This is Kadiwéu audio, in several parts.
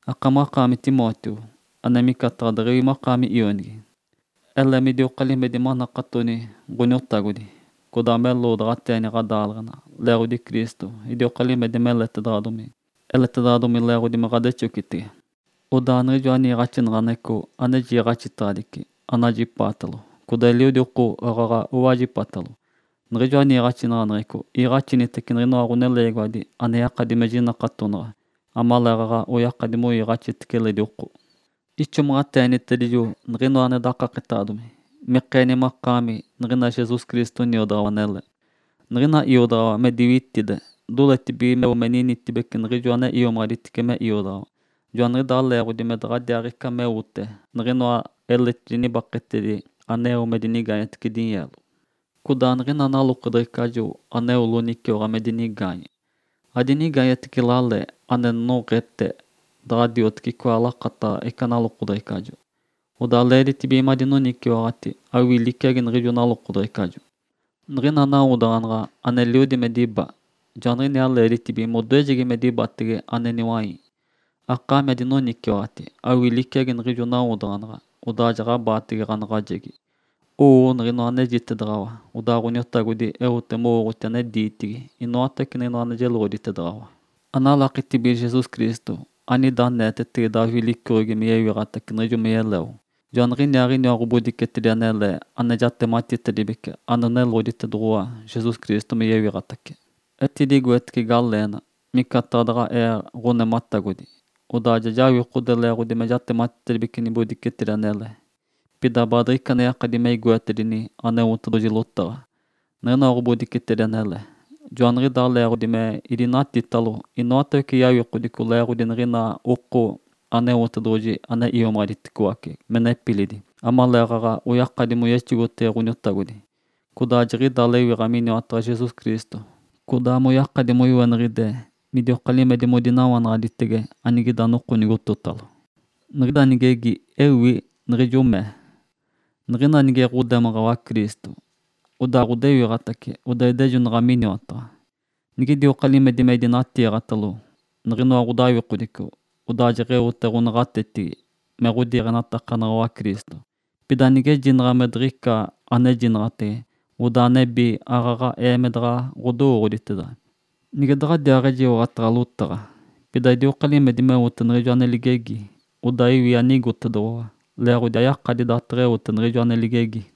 Akamaɡ̶akaami Timóteo, ane micataɡ̶a deɡ̶ewi makaami ionigi, ele midioka limedi manakatoni Ǥoniotagodi, codaa meloodaɡ̶ateeni ɡ̶adaaleɡ̶ena, leeɡ̶odi Cristo idioka limedi meletedaɡ̶adomi. Eletedoɡ̶odomi leeɡ̶odi me ɡ̶odexogotege. Odaa niɡ̶ijoa niiɡ̶axinaɡ̶aneɡ̶eco ane jiiɡ̶axitedaɡ̶adici, anajipaatalo codaa eliodi oko aaɡ̶aɡ̶a owajipatalo, niɡ̶ijoa niiɡ̶axinaɡ̶aneɡ̶eco iiɡ̶axinitece niɡ̶inoa ɡ̶oneleegiwadi ane yakadi me jinakatonaɡ̶a, amaleeɡ̶aɡ̶a oyakadi moiiɡ̶axitece eledi oko. Ixomaɡ̶ateenitedijo niɡ̶inoa ane dakaketaɡ̶adomi mikeeni makaami niɡ̶ina Jesus Cristo niodaɡ̶awa anele. Niɡ̶ina iodaɡ̶awa me diwitide, doletibige meo me ninitibece niɡ̶ijo ane iomaɡ̶aditice me iodaɡ̶awa. Joaniɡ̶idaa leeɡ̶odi me daɡ̶adiaaɡ̶ica meote niɡ̶inoa eletidi nibaketedi anowote me dinigaanyetece dinyeelo. Codaa niɡ̶ina nalokodeɡ̶ecajo aneo loniciwaɡ̶a me dinigaanye, adinigaanyetece lale ane noɡ̶ete, nige daɡ̶a dioteci icoa ane lakataɡ̶a ica nalokodeɡ̶ecajo. (Odaa leeditibige madinoniciwaɡ̶ati awii liciagi niɡ̶ijo nalokodeɡ̶ecajo). Niɡ̶ina nawodaɡ̶anaɡ̶a aneliodi me diba, joaniɡ̶iniaa leeditibige modoejegi me dibatege ane niwai. (Akaami adinoniciwaɡ̶ati awii liciagi niɡ̶ijo nawodaɡ̶anaɡ̶a, odaa jaɡ̶abaatege ɡ̶anaɡ̶ajegi.) Owoo niɡ̶inoa anejitedaɡ̶awa, odaa Ǥoniotagodi eote mowooɡ̶oti ane diitigi inoatawece niɡ̶inoa ane jeloɡ̶oditedaɡ̶awa. Analakitibige Jesus Cristo, anida aneetetege Davi licoɡ̶egi, me yewiɡ̶atace, niɡ̶ijo me yeleo. Joaniɡ̶inaaɡ̶inoa ɡ̶obodicetedi anele ane jatematitedibece, oneloɡ̶oditoɡ̶owa Jesus Cristo me yewiɡ̶atace. Etidigoetece galeenatedi micataɡ̶a daɡ̶a ee ɡ̶onematagodi, odaa ja jawikode leeɡ̶odi me jatematitedibece ɡ̶obodicetedi anele. Pida baadiɡ̶ica ane yakadi me igoetedi Aneotedoɡ̶oji lotaɡ̶a, niɡ̶inoa ɡ̶obodicetedi anele. Joaniɡ̶idaa leeɡ̶odi me idinatitalo inoatawece yawikodico leeɡ̶odi niɡ̶ina oko Aneotedoɡ̶oji ane iomaɡ̶aditedicoace me nepilidi amaleeɡ̶aɡ̶a oyakadi moyexogotege Ǥoniotagodi, odaa jiɡ̶ida lewiɡ̶a miniwataɡ̶a Jesus Cristo, codaa moyakadi moiweniɡ̶ide midioka limedi modinawanaɡ̶aditege, anigida noko nigototalo. Niɡ̶ida nigegi ewi niɡ̶ijo mee, “Niɡ̶ina nige ɡ̶odemaɡ̶awa Cristo, odaa ɡ̶odewiɡ̶atace odaa idejonaɡ̶ate miniwataɡ̶a. Nigidioka limedi me idinatiiɡ̶atalo niɡ̶inoa ɡ̶odawikodico, odaa jaɡ̶aɡ̶eote ɡ̶onaɡ̶atetigi me ɡ̶odiiɡ̶enatakanaɡ̶awa Cristo. Pida nigejinaɡ̶a me diɡ̶ica anejinaɡ̶atege, odaa nebi aaɡ̶aɡ̶aee me daɡ̶a ɡ̶odowooɡ̶oditeda. Nige daɡ̶adiaaɡ̶ejiwaɡ̶ataɡ̶a lotaɡ̶a, pida idioka limedi meote niɡ̶ijo ane ligegi (odaa iwi anigotedoɡ̶owa)”. (Leeɡ̶odi ayakadi daateɡ̶eote niɡ̶ijo ane ligegi.)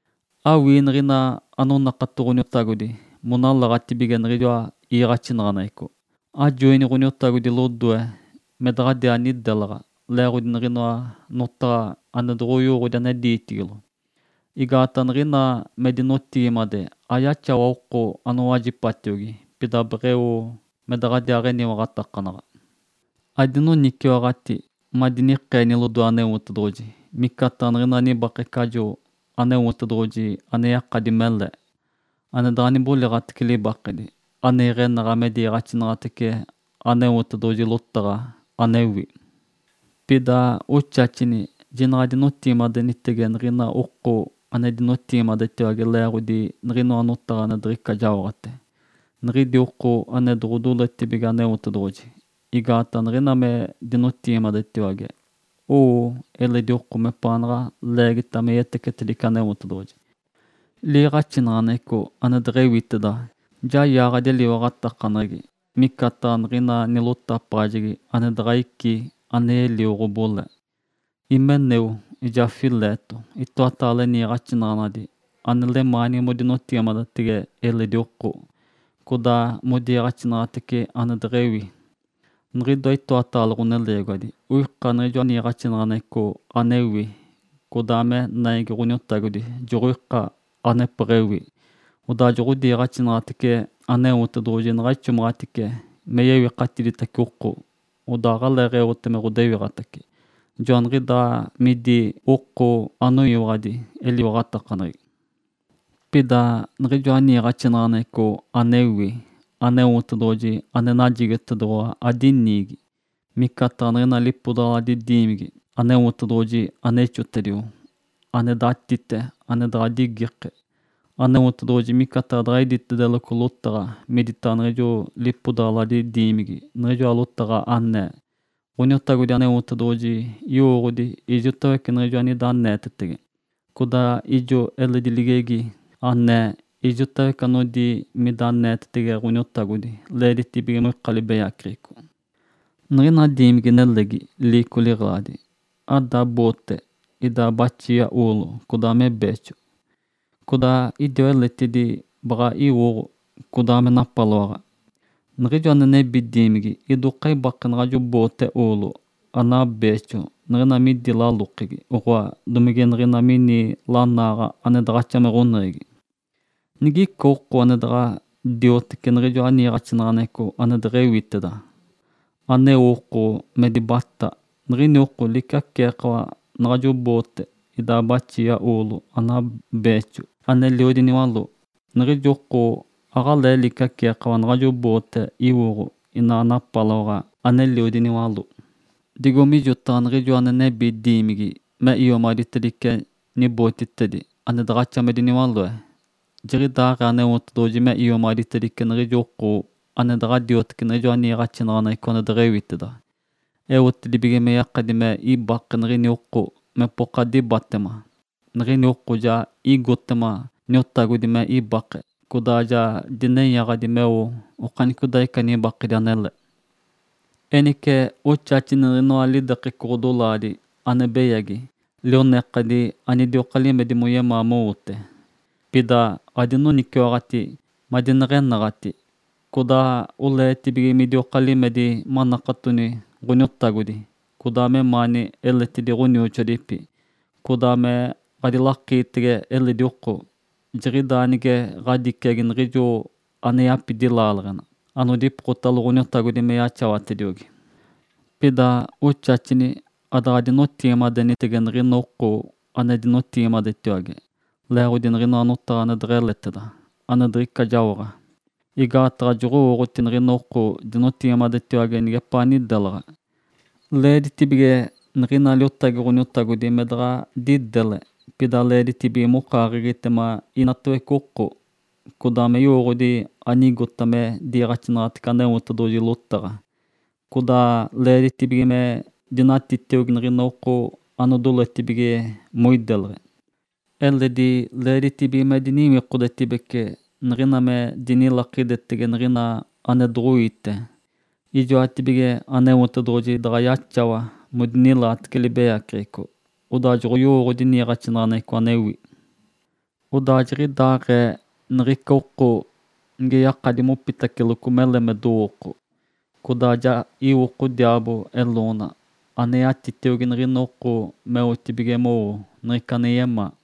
Awii niɡ̶ina anonakato Ǥoniotagodi monalaɡ̶atibige niɡ̶ijoa iiɡ̶axinaɡ̶aneɡ̶eco. Ajoini Ǥoniotagodi lodoe me daɡ̶adiaa nidelaɡ̶a leeɡ̶odi niɡ̶inoa notaɡ̶a ane doɡ̶oyowooɡ̶odi ane diitigilo, igaataɡ̶a niɡ̶ina me dinotigimade ayaxawa oko anowajipatiogi, pida beɡ̶eo me daɡ̶adiaa eniwaɡ̶atakanaɡ̶a. Adinoniciwaɡ̶ati madinikeeni lodoe Aneotedoɡ̶oji micataɡ̶a niɡ̶ica nibakecajo Aneotedoɡ̶oji ane yakadi mele, ane daɡ̶a niboliɡ̶atece libakedi, ane iɡ̶enaɡ̶a me diiɡ̶axinaɡ̶atece Aneotedoɡ̶oji lotaɡ̶a anewi. Pida oxaxini jinaɡ̶a adinotigimadenitege niɡ̶ina oko ane dinotigimadetiwage leeɡ̶odi niɡ̶inoa notaɡ̶a ane diɡ̶ica jaoɡ̶ate, niɡ̶idi oko ane doɡ̶odeemitetibige Aneotedoɡ̶oji. Igaataɡ̶a niɡ̶ina me dinotigimadetiwage, owo eledi oko mepaanaɡ̶a leegita me yetecetedice Aneotedoɡ̶oji. Liiɡ̶axinaɡ̶aneɡ̶eco ane deɡ̶ewiteda ja yaaɡ̶adi eliwaɡ̶atakaneɡ̶egi, micataɡ̶a niɡ̶ina nilotapaɡ̶ajegi ane daɡ̶a ici ane yelio ɡ̶obole. Himeneu, ijaa Fileto itoataale niiɡ̶axinaɡ̶anadi ane lemaanigi modinotigimadetege eledi oko, codaa modiiɡ̶axinaɡ̶atece ane deɡ̶ewi. Niɡ̶ijoa itoataale ɡ̶oneleegiwadi oika niɡ̶ijoa niiɡ̶axinaɡ̶aneɡ̶eco anewi, codaa me naigi Ǥoniotagodi joɡ̶oika anepeɡ̶ewi, odaa joɡ̶odiiɡ̶axinaɡ̶atece Aneotedoɡ̶oji naɡ̶a ixomaɡ̶atice me yewikatiditace oko, odaa aɡ̶aleeɡ̶eote me ɡ̶odewiɡ̶atace. Joaniɡ̶idaa midi oko anoyaaɡ̶adi eliwaɡ̶atakaneɡ̶egi. Pida niɡ̶ijoa niiɡ̶axinaɡ̶aneɡ̶eco anewi Aneotedoɡ̶oji ane najigotedoɡ̶owa adiniigi. Micataɡ̶a niɡ̶ina lipodaɡ̶aladi diimigi Aneotedoɡ̶oji ane ixotedio, ane datite, ane daɡ̶a digike. Aneotedoɡ̶oji micataɡ̶a daɡ̶a iditedeloco lotaɡ̶a miditaɡ̶a niɡ̶ijo lipodaɡ̶aladi diimigi, niɡ̶ijoa lotaɡ̶a anee, “Ǥoniotagodi Aneotedoɡ̶oji yowooɡ̶odi ijotawece niɡ̶ijo anida aneetetege”, codaa ijo eledi ligegi anee, “Ijotawece anodi mida aneetege Ǥoniotagodi, leeditibige moika libeyaceɡ̶eco.” Niɡ̶ina diimigi-nelegi, liico liɡ̶eladi, ada boote idaa baxia oolo, codaa me beexo. Codaa idiwa eletidi baɡ̶a iwoɡ̶o, codaa me napaloaɡ̶a. Niɡ̶ijo ane nebi diimigi idoka ibake naɡ̶ajo boote oolo, anaa beexo niɡ̶ina midi lalokegi, oɡ̶oa, domige niɡ̶ina mini lanaaɡ̶a ane daɡ̶axa me ɡ̶oneɡ̶egi. Nigica oko ane daɡ̶a dioteci niɡ̶ijoa niiɡ̶axinaɡ̶aneɡ̶eco ane deɡ̶ewiteda, aneo oko me nibataaɡ̶a, niɡ̶ini oko liciaceekawa naɡ̶ajo boote idaa baxia oolo, anaa beexo, aneliodi niwaló. Niɡ̶ijo oko aɡ̶alee liciaceekawa naɡ̶ajo boote iwoɡ̶o inaa napaloaɡ̶a ane deɡ̶eliodi niwaló. Digo mijotaɡ̶a niɡ̶ijo ane nebi diimigi me iomaɡ̶aditedice niɡ̶ijoa bootitedi ane daɡ̶axa me diniwaloe, jiɡ̶idaaɡ̶ee Aneotedoɡ̶oji me iomaɡ̶aditedice niɡ̶ijo oko ane daɡ̶a dioteci niɡ̶ijoa niiɡ̶axinaɡ̶aneɡ̶eco ane deɡ̶ewiteda, eotedibige me yakadi me ibake niɡ̶ini oko mepoka dibatema. Niɡ̶ini oko ja igotema Niotagodi me ibake, codaa ja dinenyaɡ̶adi meo okanicodaaɡ̶ica nibakedi anele. Enice oxaxini niɡ̶inoa lidekeco ɡ̶odolaadi ane beyagi lionekadi anidioka limedi moyemaa mowote. Pida adinoniciwaɡ̶ati madineɡ̶enaɡ̶ati, codaa oleetibige midioka limedi manakatoni Ǥoniotagodi, codaa memaani eledi ɡ̶onioxoadipi, codaa me ɡ̶adilakiitege eledi oko. Jiɡ̶idaa nige ɡ̶adiciagi niɡ̶ijo ane yapidi laaleɡ̶enali anodipokotalo Ǥoniotagodi me yaxawatediogi. Pida oxaxini adaɡ̶adinotigimadenitege niɡ̶ina oko ane dinotigimadetiwage leeɡ̶odi niɡ̶inoa notaɡ̶a ane deɡ̶eleteda, ane diɡ̶ica jaoɡ̶a, igaataɡ̶a joɡ̶owooɡ̶oti niɡ̶ina oko dinotigimade nigepaa nidelaɡ̶a. Leeditibige niɡ̶ina liotagi Ǥoniotagodi me daɡ̶a didele. Pida leeditibige mokaaɡ̶egitema inatawece oko, codaa me yowooɡ̶odi anigota me diiɡ̶axinaɡ̶atece Aneotedoɡ̶oji lotaɡ̶a, codaa leeditibige me dinatitiogi niɡ̶ina oko anodoletibige modinotigimadetege. Eledi leeditibige me diniwikodetibece niɡ̶ina me dinilakidetege niɡ̶ina ane doɡ̶oiite. Ijoatibige Aneotedoɡ̶oji daɡ̶a yaxawa modinilaatece libeyaceɡ̶eco, odaa joɡ̶oyowooɡ̶odi niiɡ̶axinaɡ̶aneɡ̶eco anewi. Odaa jiɡ̶idaaɡ̶ee niɡ̶ica oko nige yakadi mopitaceloco mele me dowooko, codaa ja iwoko diaabo eloona, ane yatitiogi niɡ̶ina oko meotibige mowo niɡ̶ica ane yemaa.